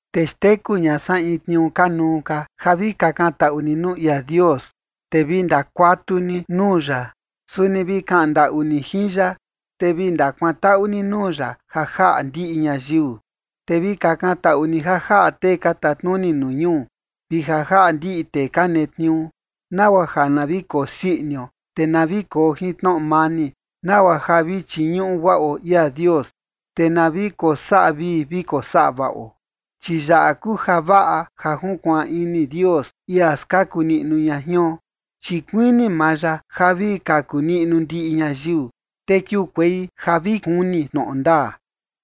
Te xteku ña san in tniuu kanuu ka ja vi kakan taꞌu ni nuu ia Dios, te vi ndakuatu ni nuu ya, suni vi kaꞌan ndaꞌu ni jin ya, te vi ndakuantaꞌu ni nuu ya ja jaꞌa ndiꞌi ñayiu. Te vi kakan taꞌu ni ja jaꞌa tee ka tatnuni nuu ñuu vi ja jaꞌa ndiꞌi tee ka netniuu, nagua ja na vi kosii inio, te na vi koo jin tnoꞌo mani, nagua ja vi chiñuꞌu guaꞌo ia Dios, te na vi kosaꞌa vii vi kosaꞌa vaꞌo. Chi yaꞌa kuu javaꞌa ja junkuaan ini Dios, ia skaku niꞌnu ña jion. Chi kuini maa ya ja vi kaku niꞌnu ndiꞌi ñayiu, te kiukuei ja vi kuni tnoꞌo ndaa.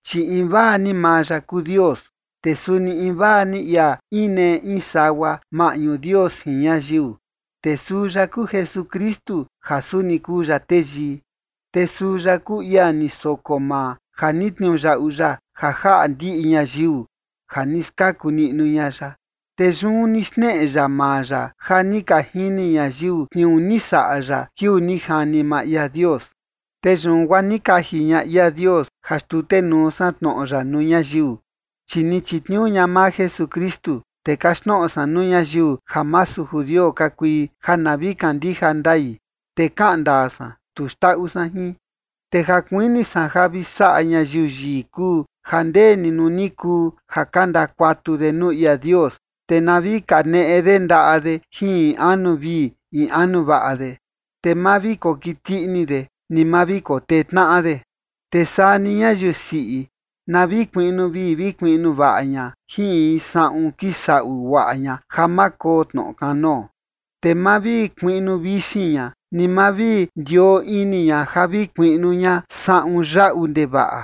Chi invaa ni maa ya kuu Dios, te suni invaa ni ia inee in sagua maꞌñu Dios jin ñayiu, te suu ya kuu Jesukristu ja suni kuu ya teyii. Te suu ya kuu ia ni soko maa ja ni tniuyaꞌu ya ja jaꞌa ndiꞌi ñayiu ja ni skaku niꞌnu ña ya, te yun ni xneꞌe ya maa ya ja ni ka jini ñayiu tniuu ni saꞌa ya kiuu ni jani maa ia Dios. Te yun guaa ni kaji ña ia Dios ja xtutenuu san tnoꞌo ya nuu ñayiu, chi ni chitniuu ña maa Jesukristu, te kaxtnoꞌo san nuu ñayiu ja masu judio ka kui ja na vi kandija ndai. Te kaꞌan ndaa san, tu xndaꞌu san jin. Te ja kuini san ja vi saꞌa ñayiu yii kuu ja ndeni nuu ni kuu ja ka ndakuatu de nuu ia Dios, te na vi kaneꞌe de ndaꞌa de jin anu vii in anu vaꞌa de. Te ma vi kokiti ini de, ni ma vi kotee tnaꞌa de. Te saa ni ñayiu siꞌi, na vi kuiꞌnu vii vi kuiꞌnu vaꞌa ña jin in saꞌun kisaꞌu guaꞌa ña ja ma koo tnoꞌo kanoo. Te ma vi kuiꞌnu vixin ña ni ma vi ndioo ini ña ja vi kuiꞌnu ña saꞌun yaꞌu ndevaꞌa.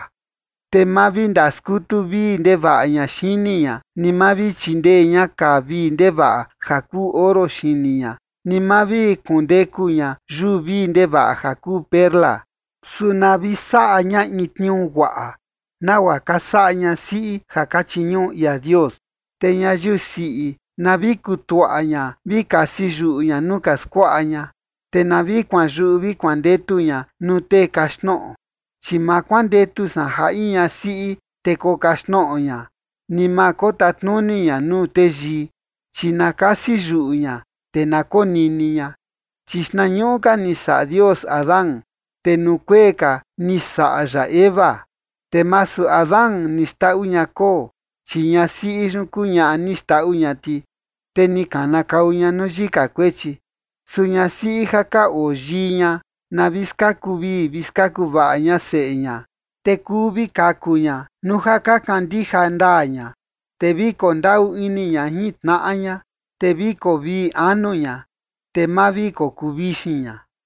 Te ma vi ndaskutu vii ndevaꞌa ña xini ña ni ma vi chindee ña kaa vii ndevaꞌa ja kuu oro xini ña, ni ma vi kundeku ña yuu vii ndevaꞌa ja kuu perla. Su na vi saꞌa ña in tniuu guaꞌa, nagua ka saꞌa ñasiꞌi ja ka chiñuꞌu ia Dios. Te ñayiu siꞌi na vi kutuaꞌa ña vi kasi yuꞌu ña nuu ka skuaꞌa ña, te na vi kuanyuꞌu vi kuandetu ña nuu tee kaxtnoꞌo. Chi ma kuandetu san ja in ñasiꞌi, te kokaxtnoꞌo ña, ni ma kotatnuni ña nuu teyii, chi na kasi yuꞌu ña, te na konini ña. Chi xtnañuꞌu ka ni saꞌa Dios Adán, te nuu kuee ka ni saꞌa ya Eva. Te masu Adán ni xndaꞌu ña koo, chi ñasiꞌi yun kuu ñaꞌa ni xndaꞌu ña ti, te ni kana kau ña nuu yika kuechi. Su ñasiꞌi ja ka oo yii ña, na vi skaku vii vi skaku vaꞌa ña seꞌe ña, te kuu vi kaku ña, nuu ja ka kandija ndaa ña, te vi kondaꞌu ini ña jin tnaꞌa ña, te vi koo vii anu ña, te ma vi kokuu vixin ña.